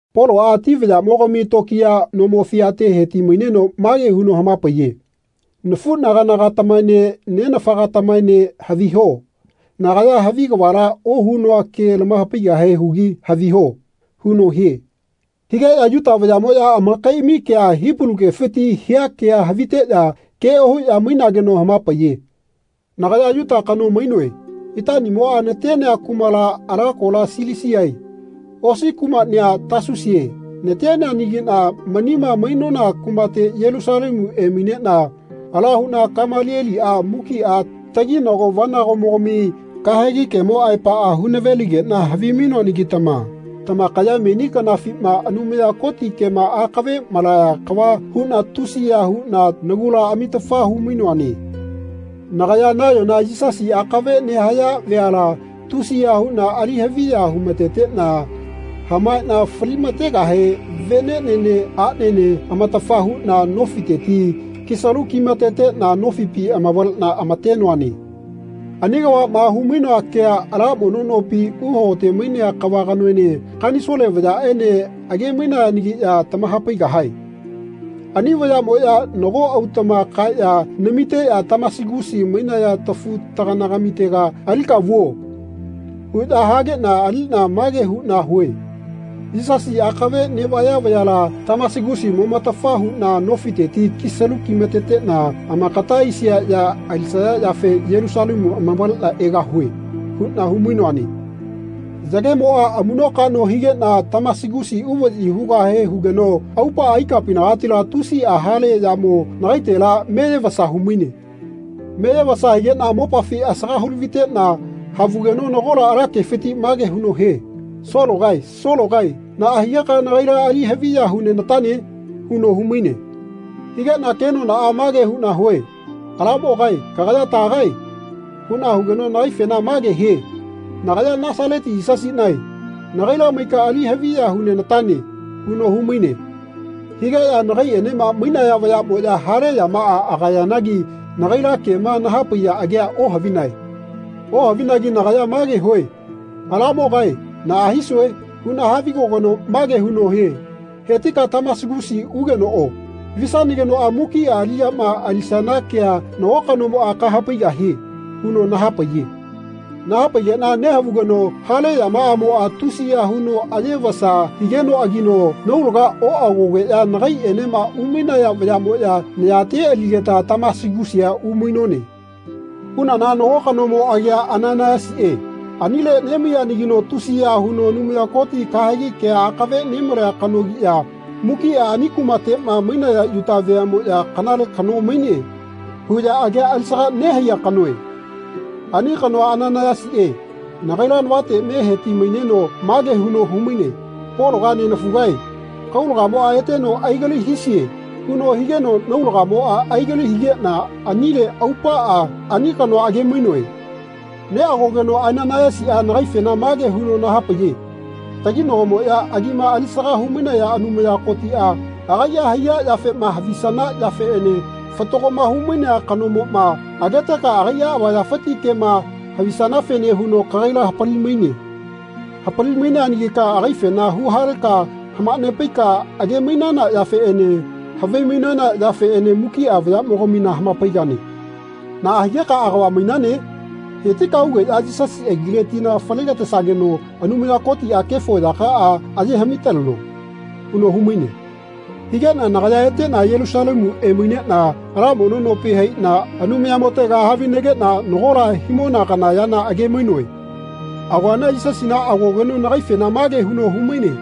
Poloꞌa ati vayaꞌmogami tokiya nomo fiate heti-maineno mage huno hamapaiye “Nafuꞌnaganagatamaene nenafagatamaene haviho nagaya havi kavala ohunoa ke lamahapaigahe hugi haviho.” huno hie. Higeꞌya Yuta vayaꞌmoꞌya amakaiꞌami kea Hipalu kefiti hia kea haviteꞌya ke ohuꞌya mainageno hamapaiye. Nagaya Yuta kano mainoe. Itaꞌnimoꞌa natenea kumala ala kola Silisiae osi kumaꞌnia Tasusie nateneanagiꞌna manima mainona kumate Yelusalemu emaineꞌna ala huꞌna Kamalieliꞌa mukiꞌa taginago-vanagomogami kahegi kemo aepaꞌa hu-naveligeꞌna havimainoanagitama tamakaya meni kanafima Anumaya Koti kema akave malaya kava huꞌna tusiya huꞌna nagula amitafa humainoane. Nagaya nayona Yisasi akave nehaya veala tusiya huꞌna ali haviya humateteꞌna hamaeꞌna fali-mategahe veneꞌnene aꞌnene amatafa huꞌna nofiteti kisalu kimateteꞌna nofipi amavaleꞌna amatenoane. Ani kavaꞌma humainoa kea ala mono nopi uhagote mainea kava kanoene Kanisole vayaꞌene age-mainayanagiꞌya tamahapaigahae. Ani vayaꞌmoꞌya nago autaꞌma kaeꞌya namiteꞌya “Tamasigusi mainaya tafu-taganagamitega alika vuo.” huꞌya hageꞌna aliꞌna mage huꞌna hue “Yisasi akave neꞌvaya vayala Tamasigusi momatafa huꞌna nofiteti kisalu kimateteꞌna amakata aisia ya alisaya yafe Yelusalemu amavaleꞌna egahue.” huꞌna humainoane. Yagemoꞌa amuꞌnokaꞌno higeꞌna Tamasigusi uvaꞌyi hugahe hugeno aupaꞌa ikapinagatila tusiꞌa hale yamo nagaitela meyevasa humaine. Meyevasa higeꞌna mopafi asaga hu-laviteꞌna havugeno nagola ala kefiti mage huno hie “Sologae Sologae naꞌa higeka nagaila ali haviya hunenatane?” huno humaine. Higeꞌna kenonaꞌa mage huꞌna hue “Alamogae kagaya tagae?” huꞌna hugeno nagaifena mage hie “Nagaya Nasaleti Yisasiꞌnae. Nagaila maika ali haviya hunenatane.” huno humaine. Higeꞌya nagaiꞌenema mainaya vayaꞌmoꞌya hale yamaꞌa agayanagi nagaila kema nahapaiya agea ohavinae. Ohavinagi nagaya mage hue “Alamogae naꞌa hisue?” huꞌna havigogeno mage huno hie “Hetika Tamasigusi ugenoꞌo. Visanagenoꞌa mukiꞌa aliꞌyama alisana kea nago kanomoꞌa kahapaigahie.” huno nahapaiye. Nahapaigeꞌna nehavugeno hale yamaꞌamoꞌa tusiya huno aye vasa higenoꞌagino naulaga oꞌagogeꞌya nagaiꞌenema umainona vayaꞌmoꞌya nayate aligeta Tamasigusia umainone. Unana nago kanomo agia Ananaiyasiꞌe anile nemaiyanagino tusiya huno Anumaya Koti kahegi kea akave nemalea kanogiꞌya mukiꞌa ani kumateꞌma mainaya Yuta veaꞌmoꞌya “Kanale kano maine.” huꞌya agia alisaga nehaiya kanoe. Ani kanoa Ananaiyasiꞌe nagaila navate me heti-maineno mage huno humaine “Pologa nenafugae kaulagamoꞌa eteno aigali hisie.” huno higeno naulagamoꞌa aigali higeꞌna anile aupaꞌa ani kanoa age-mainoe. Neꞌagogeno Ananaiyasiꞌa nagaifena mage huno nahapaiye “Taginagomoꞌya agima alisaga humainaya Anumaya Kotiꞌa agaiꞌa haiya yafema havisana yafeꞌene Fatagoma Humainea Kanomoma ageteka agai avayafiti kema havisanafene huno kagaila hapali-maine. Hapali-maineanagika agaifena huhaleka hamanepaika age-mainana yafeꞌene havimainana yafeꞌene mukiꞌa vayaꞌmogamina hamapaigane. Naꞌa higeka agava mainane? Hetika ugeꞌya Yisasi agile tina falegatesageno Anumaya Kotiꞌa kefo yakaꞌa aye haꞌmi-taleno.” huno humaine. Higeꞌna nagaya eteꞌna Yelusalemu emaineꞌna ala mono nopi haiꞌna Anumayamotega havinegeꞌna nagola himona kana yana age-mainoe. Agoana Yisasina agogeno nagaifena mage huno humaine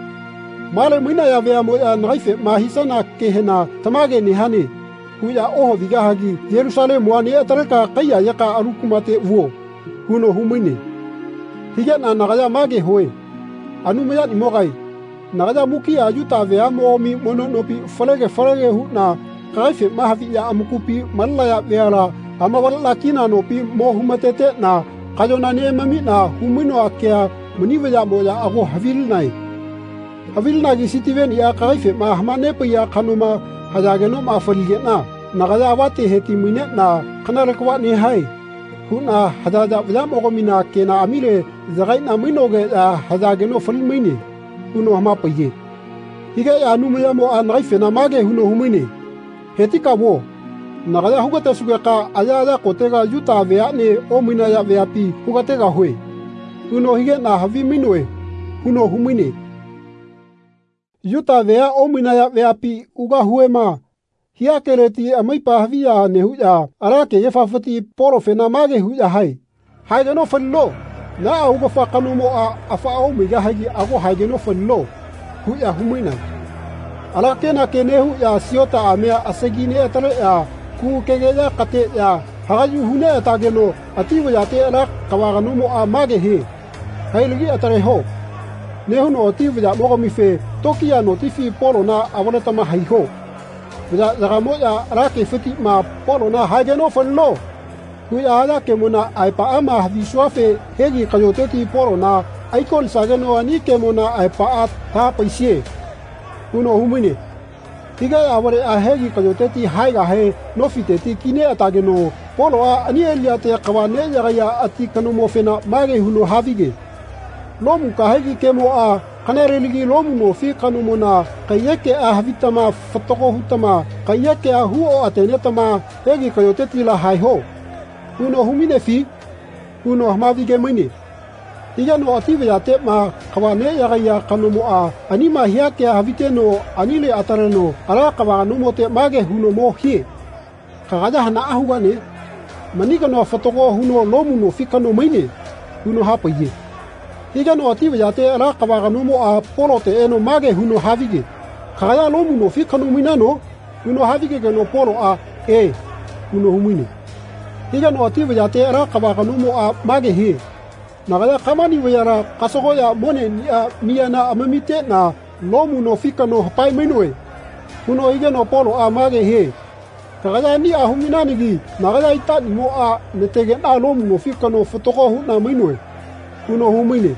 “Male mainaya veaꞌmoꞌya nagaifema hisana kehena ‘Tamage nehane.’ huꞌya ohavigahagi Yelusalemua neꞌataleka kaiyayeka alu kumate vuo.” huno humaine. Higeꞌna nagaya mage hue “Anumayanimogae nagaya mukiꞌa Yuta veaꞌmogami mono nopi falege falege huꞌna kagaifema haviꞌya amakupi malenaya veala amavaleꞌna kina nopi mo humateteꞌna kaꞌyona neꞌamamiꞌna humainoa kea mani vayaꞌmoꞌya ago havilinae. Havilinagi Sitiveniꞌa kagaifema hamanepaiya kanoma hayagenoꞌma faligeꞌna nagaya avate heti-maineꞌna ‘Kanale kava nehae.’ huꞌna hayaya vayaꞌmogamina kenaꞌamile yagaiꞌna mainogeꞌya hayageno fali-maine.” huno hamapaiye. Higeꞌya Anumayamoꞌa nagaifena mage huno humaine “Hetika vuo. Nagaya hugatesugeka ayaꞌaya kotega Yuta veaꞌne omainaya veapi hugategahue.” huno higeꞌna havimainoe huno humaine. “Yuta vea omainaya veapi ugahuema.” hia keleti amaipa haviya nehuꞌya ala kegefafiti Polofena mage huꞌya hae “Haegeno falino. Naꞌa augafa kanomoꞌa afaꞌa omaigahigi ago haegeno falino.” huꞌya humainae. Ala kenake nehuꞌya siotaꞌamia asagi neꞌataleꞌya kugukegeꞌya kateꞌya hagaꞌyu hu neꞌatageno ati vayate ala kava kanomoꞌa mage hie “Hailagi ataleho.” nehuno ati vayaꞌmogamife “Tokiya notifi Polona avaletama haiho. Vayaꞌyagamoꞌya ala kefitiꞌma Polona ‘Haegeno falino.’ huꞌya haya kemona aepaꞌama havisuafe hegi kaꞌyoteti Polona aikolisageno ani kemona aepaꞌa tahapaisie.” huno humaine. Higeꞌya avaleꞌya hegi kaꞌyoteti haegahe nofiteti kineꞌatageno Poloꞌa ani aliꞌyate kava neꞌyagaiya ati kanomofena mage huno havige “Lomu kahegi kemoꞌa ‘Kanalelagi Lomu nofi kanomona kaiyekeꞌa havitama fatago hutama kaiyekea huoꞌatenetama hegi kaꞌyotetila haeho.’ huno humainefi?” huno hamavige-maine. Higeno ati vayateꞌma kava neꞌyagaiya kanomoꞌa anima hia kea haviteno anile ataleneno ala kava kanomote mage huno mo hie “Kagaya hanaꞌa hugane? Mani kanoa fatago huno Lomu nofi kano maine.” huno hapaiye. Higeno ati vayate ala kava kanomoꞌa Polote eno mage huno havige “Kagaya Lomu nofi kano mainano?” huno havigegeno Poloꞌa “E.” huno humaine. Higeno ati vayate ala kava kanomoꞌa mage hie “Nagaya kamani vayala kasagoꞌya moneꞌniꞌa miyana amamiteꞌna Lomu nofi kano hapae-mainoe.” huno higeno Poloꞌa mage hie “Kagaya aniꞌa humainanagi nagaya itaꞌniꞌmoꞌa nategeꞌna Lomu nofi kano fatago huꞌna mainoe.” huno humaine.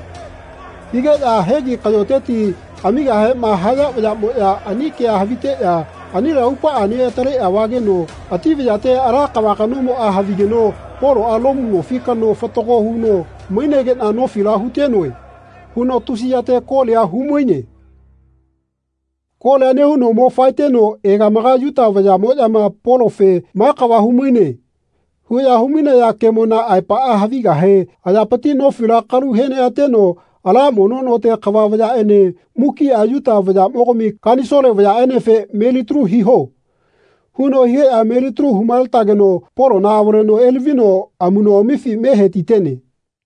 Higeꞌya hegi kaꞌyoteti amigahema haya vayaꞌmoꞌya ani kea haviteꞌya anile aupaꞌa neꞌataleꞌya vageno ati vayate ala kava kanomoꞌa havigeno “Poloꞌa Lomu nofi kano fatago huno mainegeꞌna nofila hutenoe.” huno tusi yate kolia humaine. Kolia nehuno mo faeteno egamaga Yuta vayaꞌmoꞌyama Polofe “Ma kava humaine.” huꞌya humainaya kemona aepaꞌa havigahe ayapiti nofila kalu heneꞌateno ala mono note kava vayaꞌene mukiꞌa Yuta vayaꞌmogami Kanisole vayaꞌenefe “Melitalu hiho.” huno higeꞌya melitalu humaletageno Polona avaleno elavino amuꞌnoꞌamifi me hetitene.